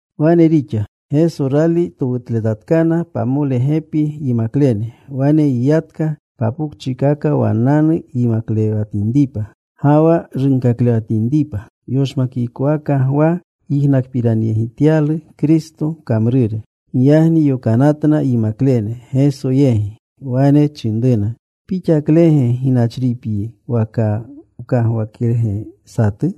Wane rixa. Geso rali towutletatkana pamole gepi yimaklene, wane yiyatka, papokchikaka wannanu yimaklewatinripa ga wa runkaklewatinripa. Yoshmakikowaka Gwa yijnakpiranyegityalu Kristo kamrure. Giyagni yokanatna yimaklene Gesyegi. Wane chinruna, “¿Pixaklege ginachripyi, waka wkagwakerge satu?”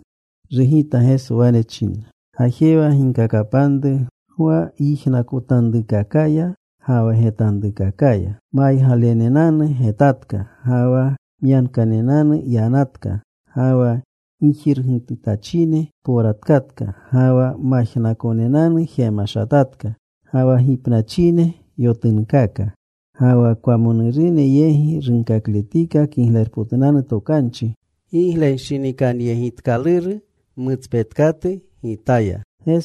Rugita Geso. Wane chinna, “Gajewa. Ginkakapanru Gwa gyijnakotanrukakaya ga wa getanrukakaya. Maygalenenanu getatka. Ga wa myankanenanu yanatka. Ga wa gijirgitunatachine powratkatka. Ga wa majnakonenanu jemashatatka. Ga wa gipnachine yotunkaaka. Ga wa kwamonurune yegi runkakletika Kiglerpotunanu Tokanchi. Giglenshinikanyegitkaluru mutspetkatu Gitaya.”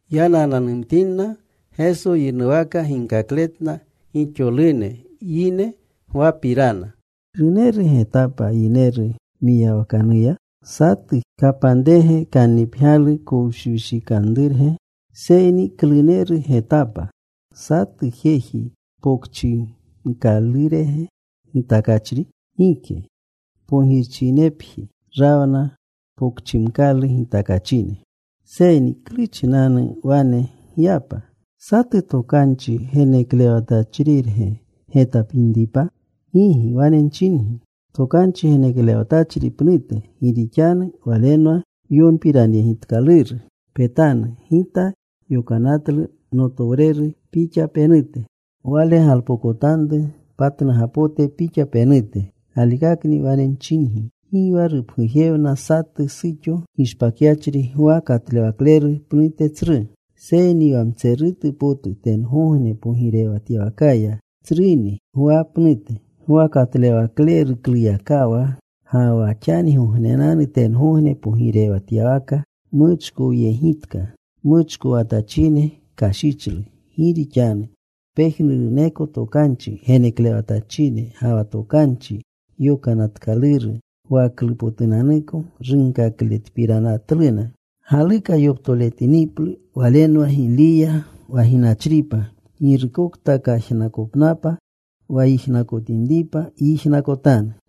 Yanananumtinna, Geso yinuwaka ginkakletna gixolune yine Gwapirana, “¿Kluneru getapa yineru mwiyawakanuya? ¿Satu kapanrege kannipgyalu kowshikanrurge? Seyni ¿kluneru getapa? ¿Satu jeji popchimkalurege gitakachri? Gike. Pogirchinepji rawna popchimkalu gitakachine. Seyni ¿klu chinanu wane gyapa? ¿Satu tokanchi geneklewatachrirge getapinripa? Gigi, wane nchingi. Tokanchi geneklewatchri pnute. Gi rixanu walenwa yonpiranyegitkaluru: Petanu. Gita yokanatlu notowreru pixa penute. Wale galpokotanru patnugapote pixa penute. “Galikakni wane nchingi, gi wa rupgujewna satu suxo gishpakyachri, Gwa Katlewakleru pnute tsru. Seyni wa mtserutu potu tengogne pogirewatyawakaya tsruni Gwa pnute. Gwa Katlewaklerukluyakawa ga wa xanigognenanu tengogne pogirewatyawaka muchkowyegitka. Muchkowatachine kashichlu. Gi rixanu pejnuruneko tokanchi geneklewatachine ga wa tokanchi yokanatkaluru Gwaklupotunanuko runkakletpiranatluna. Galuka yoptoletiniplu walenwa Giliya wa ginachripa. Girukokta kajnakopnapa wa yijnakotinripa, yijnakotanu.”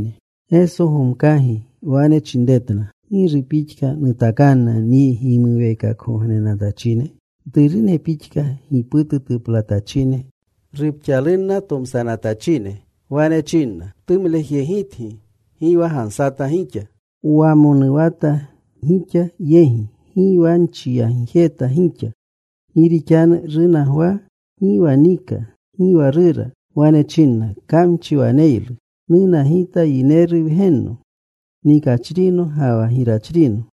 Geso gomkagi wane chinretna, “¿Giru pixka nutakanna nyi gimuweekakgognenatachine? Mturune pixka, giputu tuplanatachine, rupxalunna tomsanatachine. Wane chinna: Wtumlejyegitgi. Gi wa gansata gixa. Wamonuwata gixa yegi. Gi wa nchiyagjeta gixa. Gi rixanu runa Gwa. Gi wa nika. Gi wa rura. Wane chinna, ‘Kamchi waneylu.’ Nuna Gita Yineru Wgenno, nikachrino ga wa girachrino.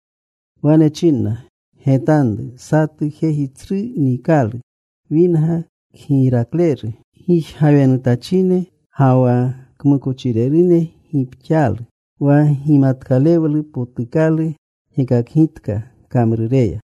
Wane chinna, ‘Getanru. Satu jeji tsru nikalu. Winga kgirakleru. Gijgawenutachine ga wa kmukochirerune gipxaalu.’ “Wa gimatkalewlu potukalu gekakgitka kamrureya.”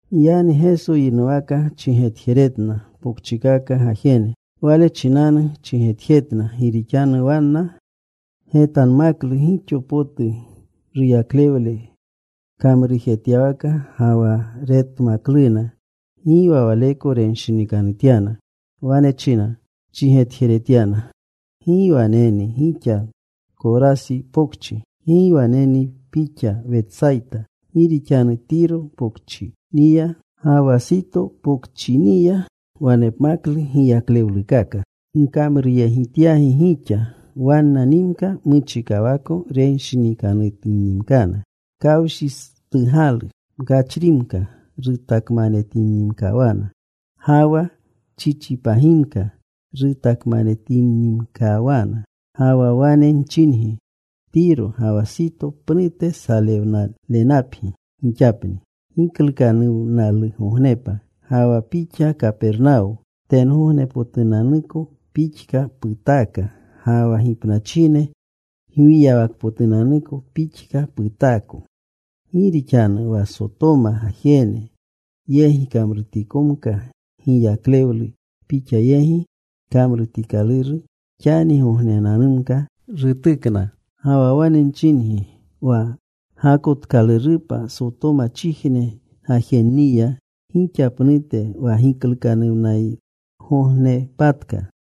Giyagni Geso yinuwaka chigetjeretna pokchikaka gajene. Wale chinanu chigetjetna gi rixanu wanna getanmaklu gixo potu ruyaklewle kamrujetyawaka. Ga wa retmakluna, gi waleko renshinikanutyana. Wane china chigetjeretyana, “¡Gi waneni pixa Korasi pokchi! ¡Gi waneni pixa Wetsayta! Gi rixanu Tiro pokchiniya ga wa Sito pokchiniya wanepmaklu giyaklewlukaka nkamruyegityagi gixa, wannanimka muchikawako renshinikanutannimkana. Kawshistugalu mkachrimka rutakmanetinnimkawanna ga wa chichipagimka rutakmanetinnimkawana. Ga wa wane nchingi, Tiro ga wa Sito pnute salewnalenapgi gixapni giklukanuwnalugognepa. Ga wa pixa Kapernawo, tengognepotunanuko pixka putaaka. Ga wa gipnachine gwiyawakapotunanuko pixka putaako. Gi rixanu wa Sotoma gajene yegi kamrutikomka giyaklewlu pixa yegi kamrutikaluru, xanigognenanumka rutukna. Ga wa wane nchingi wa gakotkalurupa Sotomachijne gajenniya gixa pnute wa giklukanuwnalgognepatka.”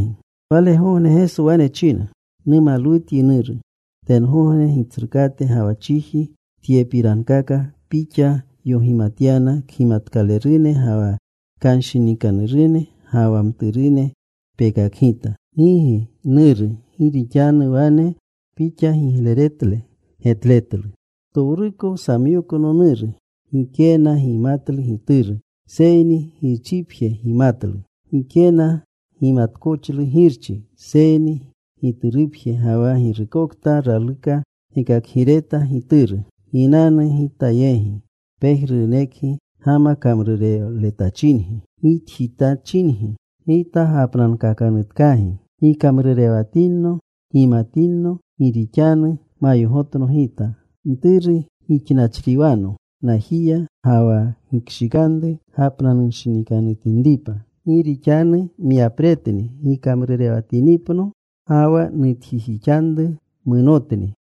Walegogne Geso wane china, “Numalwutyi, Nuru, tengogne Gitsrukate ga wa chiji, tyepirankaka Pixa yogimatyana kgimatkalerune ga wa kanshinikanurune, ga wa mturune pekakgita. Gigi, Nuru, gi rixanu wane Pixa gigleretle getletlu. “Ptowruko samyokno Nuru. Gikena gimatlu Gituru, seyni Girchipje gimatlu. Gikena gimatkoxlu Girchi, seyni Giturupje ga wa girukokta raluka gekakgireta Gituru. “Ginanu Gita yegi, pejnurunekgi gama kamrurewletachingi, gitjitachingi. Gita gapnankakanutkagi. Gikamrurewatinno. Gimatinno. Gi rixanu mayogotno Gita. Mturu gixnachriwano najiya. Ga wa gikshikanru gapnanunshinikanutinripa. Gi rixanu myapretni gikamrurewatinipno. Ga wa nutjitanru munotni.”